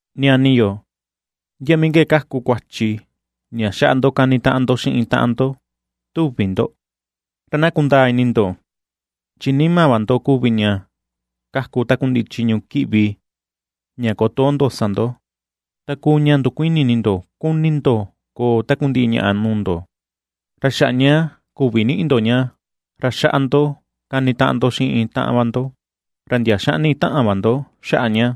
Ñani yo, ¿ndia mii ke kaku kuachi ña xaꞌa ndo kanitaꞌan ndo xiꞌin taꞌan ndo tuvi ndo? Ra na kundaa ini ndo, chi nima va ndo kuvi ña kaku takundiꞌi chiñu kiꞌvi ña kotoo ndo sa ndo. Ta kuu ña ndukuini ini ndo kuni ndo koo takundiꞌi ñaꞌa nuu ndo, ra xaꞌa ña küvi niꞌi ndo ña, ra xaꞌa ndo kanitaꞌan ndo xiꞌin taꞌan va ndo, ra ndia xaꞌni taꞌan va ndo xaꞌa ña.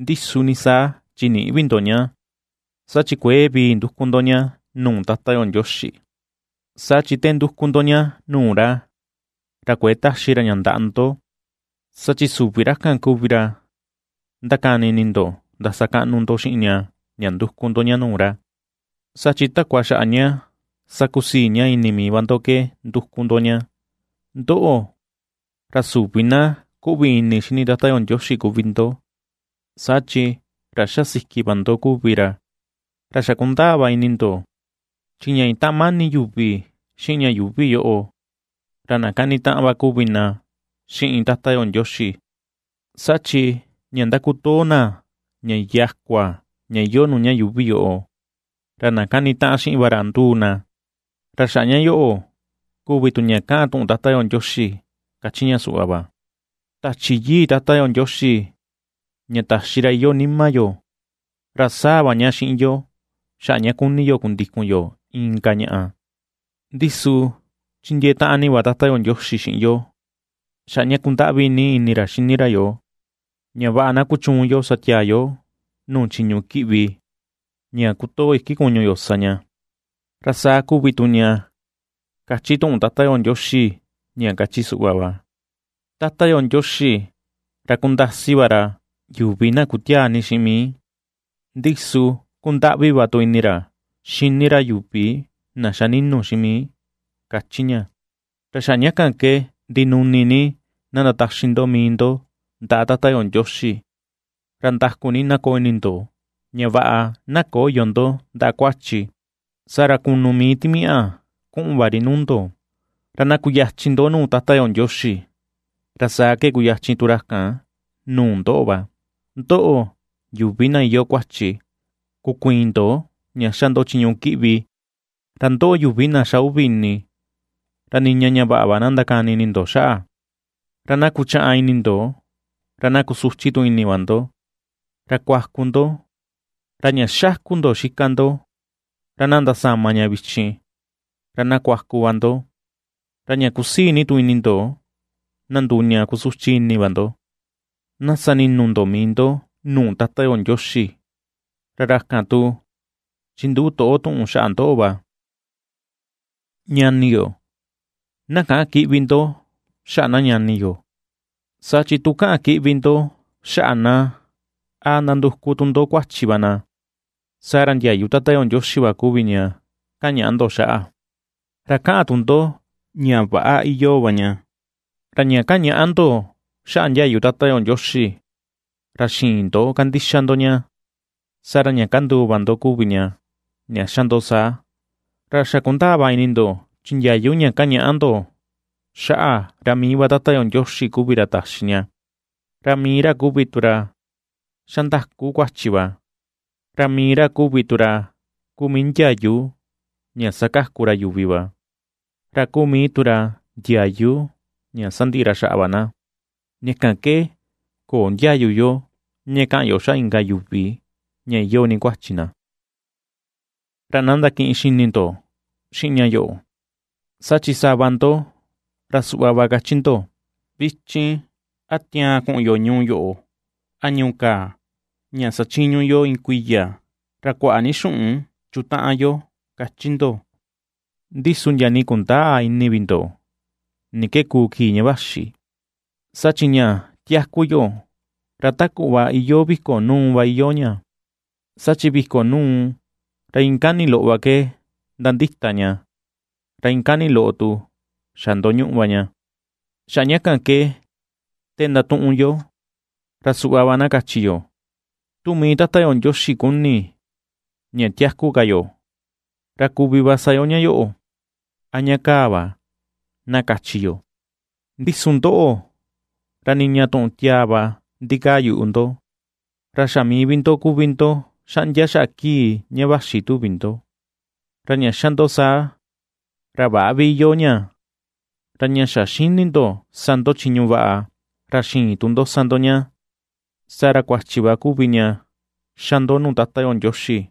Ndi su ni saa chi nïꞌi vi ndo ña, saa chi kuëe vii nduku ndo ña nuu Tata yo Ndioxi. Saa chi te nduku ndo ña nuu ra, ra kuëe taxi ra ña ndaꞌa ndo, saa chi süvi ra kan kuvi ra ndakani ini ndo ndasakaꞌnu xiꞌin ña ña nduku ndo ña nuu ra, saa chi takua xaꞌa ña sakusii ña ini mii va ndo ke nduku ndo ña. Ndoꞌo, ra süvi na kuꞌvi ini xini Tata yo Ndioxi kuvi ndo, saa chi ra xa siki va ndo kuvi ra. Ra xa kundaa va ini ndo, chi ña itaꞌan mani yuvi xiꞌin ña yuuvi yoꞌo, ra na kanitaꞌan va kuvi na xiꞌin Tata yo Ndioxi, saa chi ña ndakutoo na ña yakua iyoo nuu ña yuuvi yoꞌo, ra na kanitaꞌan xiꞌin va ra nduu na. Ra xaꞌa ña yoꞌo kuvi tu ña kaꞌan tuꞌun Tata yo Ndioxi kachi ña suꞌva va: “Tachi Yii Tata yo Ndioxi ña taxi ra iyoo nima yo, ra saa va ña xiꞌin yo xaꞌa ña kuni yo kundikun yo inka ñaꞌa.” Ndi su chindiee taꞌan ni va Tata yo Ndioxi xiꞌin yo xaꞌa ña kundaꞌvi ni ini ra xini ra yoo, ña vaꞌa na kuchuun yo sa tiaa yo nuu chiñu kiꞌvi ña kutoo iki kuñu yo sa ña. Ra saa kuvi tu ña kachi tuꞌun Tata yo Ndioxi ña kachi suꞌva va: “Tata yo Ndioxi ra kundasi va ra yuvi na kutiaa ni xiꞌin mii, ndi su kundaꞌvi va tu ini ra xini ra yuvi na xa ninu xiꞌin mii”, kachi ña. Ra xaꞌa ña kan ke ndinuni ni na ndataxi ndo mii ndo ndaꞌa Tata yo Ndioxi, ra ndaku ni na koo ini ndo ña vaꞌa na köyo ndo ndaꞌa kuachi, saa ra kunu mii timiaꞌa kuꞌun va ri nuu ndo. Ra na kuyachin ndo nuu Tata yo Ndioxi, ra saa ke kuyachin tu ra kan nuu ndoꞌo va. Ndoꞌo, yuvi na iyoo kuachi, kukuiin ndo ña xa ndo chiñu kiꞌvi, ra ndoꞌo yuvi na xa uvi ini, ra niña ña vaꞌa va na ndakani ini ndo xaꞌa. Ra na kuchaꞌan ini ndo, ra na kusuchi tu ini va ndo, ra kuaku ndo. Ra ña xáku̱ ndo xika ndo, ra na ndasama ña vichin, ra na kuaku va ndo, ra ña kusii ni tu ini ndo na nduu ña kusuchi ini va ndo. Na sani̱nu̱ ndo mii ndo nuu Tata yo Ndioxi, ra ra kan tu chinduꞌu toꞌo tuꞌun xaꞌa ndoꞌo va. Ñani yo, na käꞌan kiꞌvi ndo xaꞌa na ñani yo. Saa chi tu kaꞌan kiꞌvi ndo xaꞌa na, a ndanduku tu ndo kuachi va na, saa ra ndiayu Tata yo Ndioxi va kuvi ña kañaꞌa ndo xaꞌa, ra kaꞌan tu ndo ña väꞌa iyoo va ña. Ra ña kañaꞌa ndo xaꞌa ndiayu Tata yo Ndioxi, ra xïin ndo kandixa ndo ña, saa ra ña kanduu va ndo kuvi ña, ña xa ndo saa. Ra xa kundaa va ini ndo chi ndiayu ña kañaꞌa ndo xaꞌa ra mii va Tata yo Ndioxi kuvi ra taxi ña, ra mii ra kuvi tu ra xa ndaku kuachi va. Ra mii ra kuvi tu ra kuu mii ndiayu ña sakaku ra yuvi va, ra kuu mii tu ra ndiayu ña sandiꞌi ra xaꞌa va na. Ña kan ke köo ndiayu yo ña kaꞌan yo xaꞌa inka yuvi ña iyoo ni kuachi na. Ra na ndakiꞌin xini ndo xiꞌin ña yoꞌo, saa chi sava ndo ra suꞌva va kachi ndo: “Vichin a tiaan kuꞌun yo ñuu yoꞌo, a ñuu kaa, ña sachiñu yo iin kuiya, ra kuaꞌa ni xuꞌun chutaꞌan yo”, kachi ndo. Ndi su ndia nii kundäa tu ini vi ndo ni ke kuu kii ña vaxi. Saa chi ña tiaku yo, ra ta kuꞌva iyoo viko nuu va iyoo ña, saa chi viko nuu, ra iin kani loꞌo va ke ndandita ña, ra iin kani loꞌo tu xa ndoñuꞌu va ña. Xaꞌa ña kan ke te ndatuꞌun yo ra suꞌva va na kachi yo: “Tu mii Tata yo Ndioxi kuni ña tiaku ka yo, ra kuvi sa yo ña yoꞌo, a ña kaa va”, na kachi yo. Ndi su ndoꞌo, ra niña tuꞌun tiaa va ndikaa yuꞌu ndo, ra xa mii vi ndo kuvi ndo xaꞌndia xaa kii ña vaxi tuvi ndo, ra ña xa ndo saa, ra väꞌa vi iyoo ña. Ra ña xa ^xini ndo sa ndo chiñu vaꞌa, ra ^xïin tu ndo sa ndo ña, saa ra kuachi va kuvi ña ^xa ndo nuu Tata yo Ndioxi.